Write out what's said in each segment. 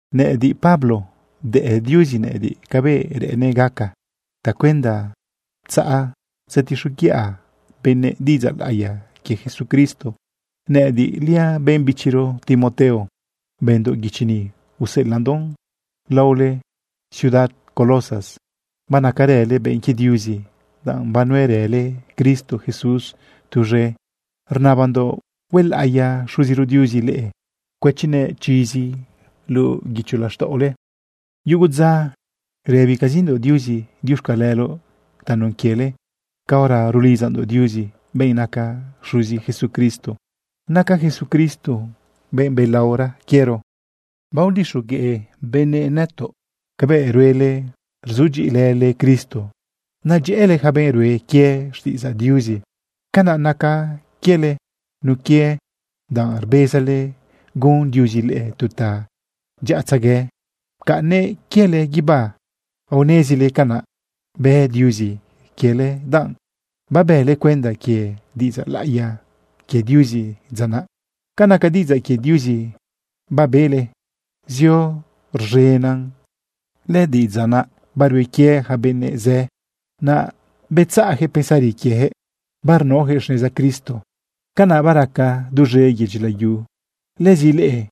Nëꞌëdiꞌ, Pablo, bdëꞌ Diuzi nëꞌëdiꞌ cabëꞌ reꞌennëꞌ gaca tacuenda tzaꞌ tzetixoguiꞌa benëꞌ diꞌidzaꞌ laꞌiya quie Jesucristo. Nëꞌëdiꞌliaꞌ benꞌ bichiro Timoteo, bëndoꞌ guichi ni, useꞌelaꞌndoꞌn laole ciudad Colosas. Banacarële benꞌ quie Diuzi danꞌ banuerële Cristo Jesús tuz̃e. Rnabandoꞌ huelaꞌiya Xuziro Diuzi leꞌe cuëchinëꞌ chizi luꞌu guicho laxtaꞌole. Yugu dza rëbicazindoꞌ Diuzi diuxcaleloꞌ tanun quiele caora rulidzandoꞌ Diuzi, benꞌ naca Xuzi Jesucristo. Naca Jesucristo benꞌ belaora quiero. Bagudyi benëꞌ nëtoꞌ cabëꞌ ruele rzudyiꞌilële Cristo, nadyëꞌële yaca benꞌ rue quie xtiꞌidzaꞌ Diuzi. Canaꞌ naca quiele nun quie danꞌ rbezale gun Diuzi leꞌe tu tadyaꞌatzegue pcaꞌnnëꞌ quiele guibá. Aonezile canaꞌ bë Diuzi quiele danꞌ babële cuenda quie diꞌidzaꞌ laꞌiya quie Diuzi dza naꞌ. Ca naca diꞌidzaꞌ quie Diuzi babele zio rz̃enan, lëdiꞌidzaꞌ naꞌ barue quie yaca benꞌ zë, naꞌ betzaꞌyaquëꞌ pensari quieyaquëꞌ, barnaoyaquëꞌ xneza Cristo. Canaꞌ baraca duz̃e yedyi layu. Lëzi leꞌe,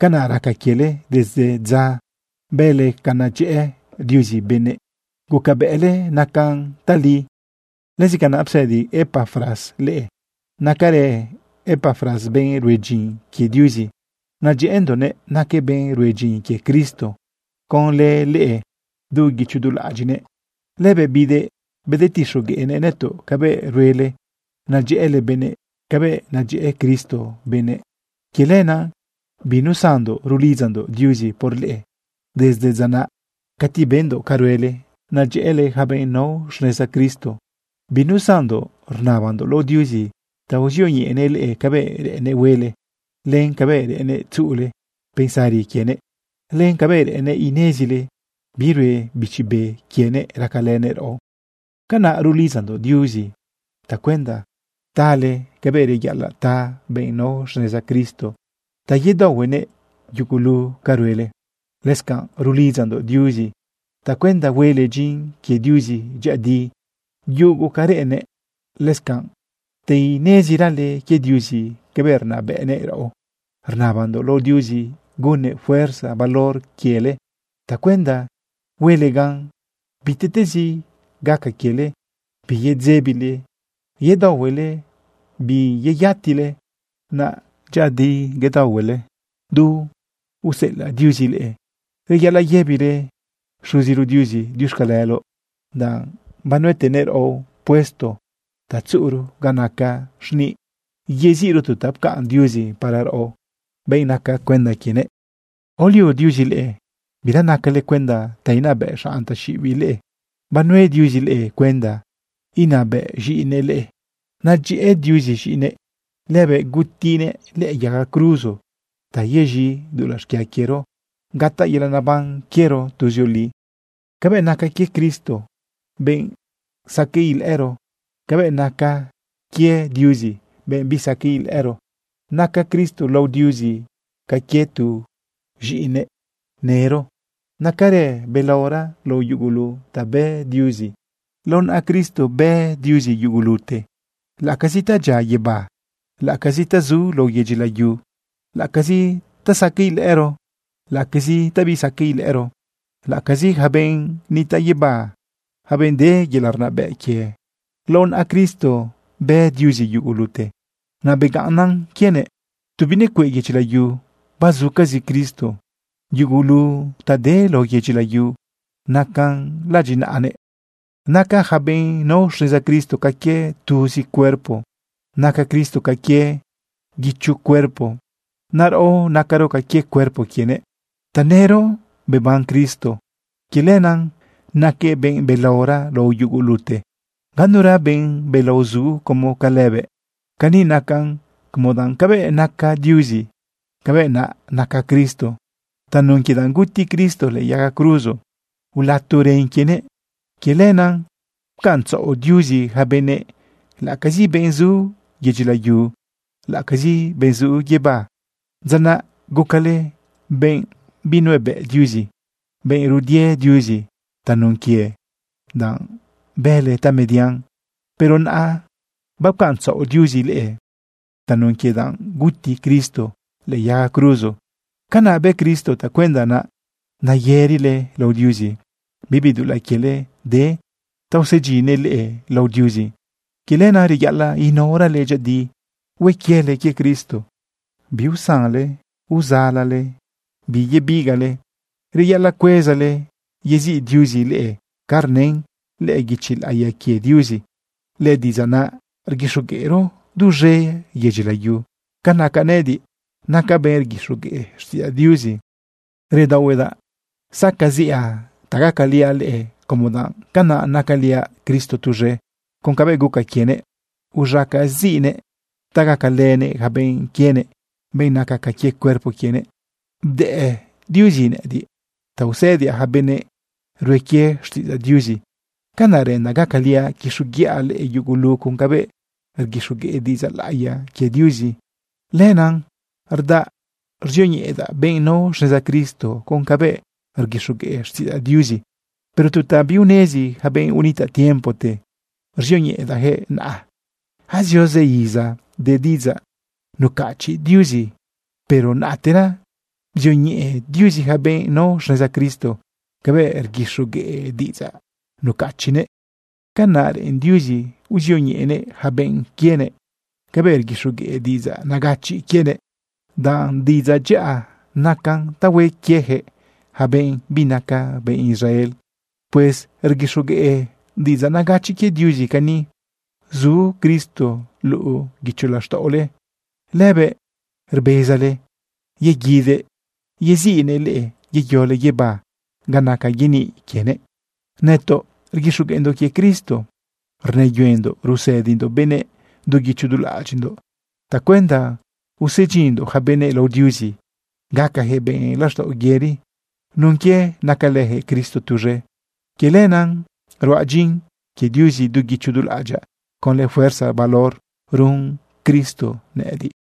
canaꞌ raca quiele desde dza bele ca nadyëꞌë Diuzi benëꞌ, gucabëꞌle nacan tali. Lëzi canaꞌ psëdi Epafras leꞌe. Nacarë Epafras benꞌ rue dyin quie Diuzi. Nadyëꞌëndoꞌnëꞌ. Naquëꞌ benꞌ rue dyin quie Cristo conlë leꞌe du guicho du laꞌadyiꞌnëꞌ. Lëbëꞌ bidëꞌ bedetixogueꞌnëꞌ nëtoꞌ cabëꞌ ruele nadyëꞌële benëꞌ cabëꞌ nadyëꞌë Cristo benëꞌ. Quie lenaꞌ binusandoꞌ rulidzandoꞌ Diuzi por leꞌe desde dza naꞌ cati bendoꞌ ca ruele nedyëꞌële yaca benꞌ nao xneza Cristo. Binusandoꞌ rnabandoꞌ lao Diuzi ta uzioñeꞌenëꞌ leꞌe cabëꞌ reꞌennëꞌ huele, len cabëꞌ reꞌennëꞌ tzuꞌule pensari quienëꞌ, len cabëꞌ reꞌennëꞌ inezile bi rue Bichi Be quienëꞌ racalënëꞌ raꞌo. Canaꞌ rulidzandoꞌ Diuzi tacuenda tale cabëꞌ reyaꞌalaꞌ ta benꞌ nao xneza Cristo ta yedaohuenëꞌ yugulu ca ruele. Lëscanꞌ rulidzandoꞌ Diuzi tacuenda huele dyin quie Diuzi dyëꞌëdi yugu ca reꞌennëꞌ, lëscanꞌ ta inezirale quie Diuzi cabëꞌ rnabëꞌnëꞌ raꞌo. Rnabandoꞌ lao Diuzi gunnëꞌ fuerza valor quiele tacuenda huele gan bitiꞌtezi gaca quiele biyedzebile yedaohuele biyeyatile, naꞌ dyëꞌëdi yedaohuele du usela Diuzi leꞌe. Reyaꞌalaꞌ yëbile Xuziro Diuzi diuxcaleloꞌ, danꞌ banuetenëꞌ raꞌo puesto ta tzuꞌuro ga naca xniꞌ yeziꞌro tu ta pcaꞌn Diuzi para raꞌo, benꞌ naca cuenda quienëꞌ. Aolio Diuzi leꞌe, bira nacale cuenda ta inabëꞌ xanꞌ taxiꞌibiꞌ leꞌe. Banue Diuzi leꞌe cuenda inabëꞌ z̃iꞌinëꞌ leꞌe. Nadyëꞌë Diuzi z̃iꞌinëꞌ. Lëbëꞌ gutinëꞌ lëꞌë yaga cruzo ta yez̃i dulaꞌ xquia quiero gataꞌ yelaꞌ neban quiero tuzioli. Cabëꞌ naca quie Cristo, benꞌ saqueꞌ ilëꞌëro, cabëꞌ naꞌ naca quie Diuzi, benꞌ bisaqueꞌ ilëꞌëro. Naca Cristo lao Diuzi ca quie tu z̃iꞌinëꞌ nëro. Nacarëꞌ belaora lao yugulu ta bë Diuzi. Lao naꞌa Cristo bë Diuzi yugulute, laꞌacazi ta dyia guibá, laꞌacazi ta zu lao yedyi layu, laꞌacazi ta saqueꞌ ilëꞌëro, laꞌacazi ta bisaqueꞌ ilëꞌëro, laꞌacazi yaca benꞌ nitaꞌ guibá, yaca benꞌ de yelaꞌ rnabëꞌ quie. Lao naꞌa Cristo bë Diuzi yugulute, naꞌ begaꞌnnan quienëꞌ. Tu binecueꞌ yedyi layu bazucazi Cristo. Yugulu ta de lao yedyi layu nacan laꞌadyiꞌnaꞌanëꞌ. Naca yaca benꞌ nao xneza Cristo ca quie tuzi cuerpo. Naca Cristo ca quie guicho cuerpo naꞌ. Naꞌ raꞌo nacaro ca quie cuerpo quienëꞌ. Tanëro beban Cristo. Quie lenaꞌ naquëꞌ benꞌ belaora lao yugulute. Ganura benꞌ belao zu como ca lëbëꞌ. Cani nacan, como danꞌ cabëꞌ naca Diuzi, cabëꞌ naꞌ naca Cristo. Tanun quie danꞌ guti Cristo lëꞌë yaga cruzo ulato ren quienëꞌ, quie lenaꞌ pcaꞌntzaꞌo Diuzi yaca benëꞌ, laꞌacazi benꞌ zu yedyi layu, laꞌacazi benꞌ zu guibá. Dza naꞌ gucale benꞌ binuebëꞌ Diuzi, benꞌ rudie Diuzi tanun quie danꞌ bële tamedian. Pero naꞌa bapcaꞌntzaꞌo Diuzi leꞌe tanun quie danꞌ guti Cristo lëꞌë yaga cruzo. Canaꞌ bë Cristo tacuenda naꞌ nayërile lao Diuzi, bibi dulaꞌ quiele de ta usedyinnëꞌ leꞌe lao Diuzi. Quie lenaꞌ reyaꞌalaꞌ inaorale dyëꞌëdi hue quiele quie Cristo. Biusanle uzalale biyebigaꞌle. Reyaꞌalaꞌ cuezale yeziꞌ Diuzi leꞌe ca rnën lëꞌë guichi laꞌiya quie Diuzi. Lëdiꞌidzaꞌ naꞌ rguixogueꞌro duz̃e yedyi layu. Ca naca nëꞌëdiꞌ, nacaꞌ benꞌ rguixogueꞌ xtiꞌidzaꞌ Diuzi. Redaohuedaꞌ sacaziꞌa ta gacaliaꞌ leꞌe como danꞌ canaꞌ nacaliaꞌ Cristo tuz̃e con cabëꞌ guca quienëꞌ uz̃acaziꞌnëꞌ ta gacalënëꞌ yaca benꞌ quienëꞌ, benꞌ naca ca quie cuerpo quienëꞌ. Bdëꞌ Diuzi nëꞌëdiꞌ ta usëdiaꞌ yaca benꞌ rue quie xtiꞌidzaꞌ Diuzi. Canaꞌ reꞌendaꞌ gacaliaꞌ quixoguiꞌa leꞌe yugulu con cabëꞌ rguixogueꞌ diꞌidzaꞌ laꞌiya quie Diuzi. Lenaꞌ rdaꞌa ruzioñeꞌedaꞌ benꞌ nao xneza Cristo con cabëꞌ rguixogueꞌ xtiꞌidzaꞌ Diuzi, pero tu ta biunezi yaca benꞌ unitaꞌ tiempote ruzioñeꞌedaꞌyaquëꞌ naꞌa. Azio zë iza de diꞌidzaꞌ nucachiꞌ Diuzi, pero naꞌtera bzioñeꞌe Diuzi yaca benꞌ nao xneza Cristo cabëꞌ rguixogueꞌ diꞌidzaꞌ nucachiꞌnëꞌ. Canaꞌ reꞌen Diuzi uzioñeꞌenëꞌ yaca benꞌ quienëꞌ cabëꞌ rguixogueꞌ diꞌidzaꞌ nagachiꞌ quienëꞌ, danꞌ diꞌidzaꞌ dyaꞌa nacan ta hue quieyaquëꞌ yaca benꞌ binaca benꞌ Israel. Pues rguixogueꞌ diꞌidzaꞌ nagachiꞌ quie Diuzi cani: Zu Cristo luꞌu guicho laxtaꞌole. Lëbëꞌ rbezale yeguidëꞌ yeziꞌnëꞌ leꞌe yeyole guibá ga naca yeniꞌ quienëꞌ. Nëtoꞌ rguixogueꞌndoꞌ quie Cristo. Rnëyuendoꞌ rusëdindoꞌ benëꞌ du guicho du laꞌadyiꞌndoꞌ tacuenda usedyinndoꞌ yaca benëꞌ lao Diuzi gacayaquëꞌ benꞌ laxtaꞌo yëri nun quie nacalëyaquëꞌ Cristo tuz̃e. Quie lenaꞌ ruaꞌ dyin quie Diuzi du guicho du laꞌadyaꞌ conlë fuerza valor run Cristo nëꞌëdiꞌ.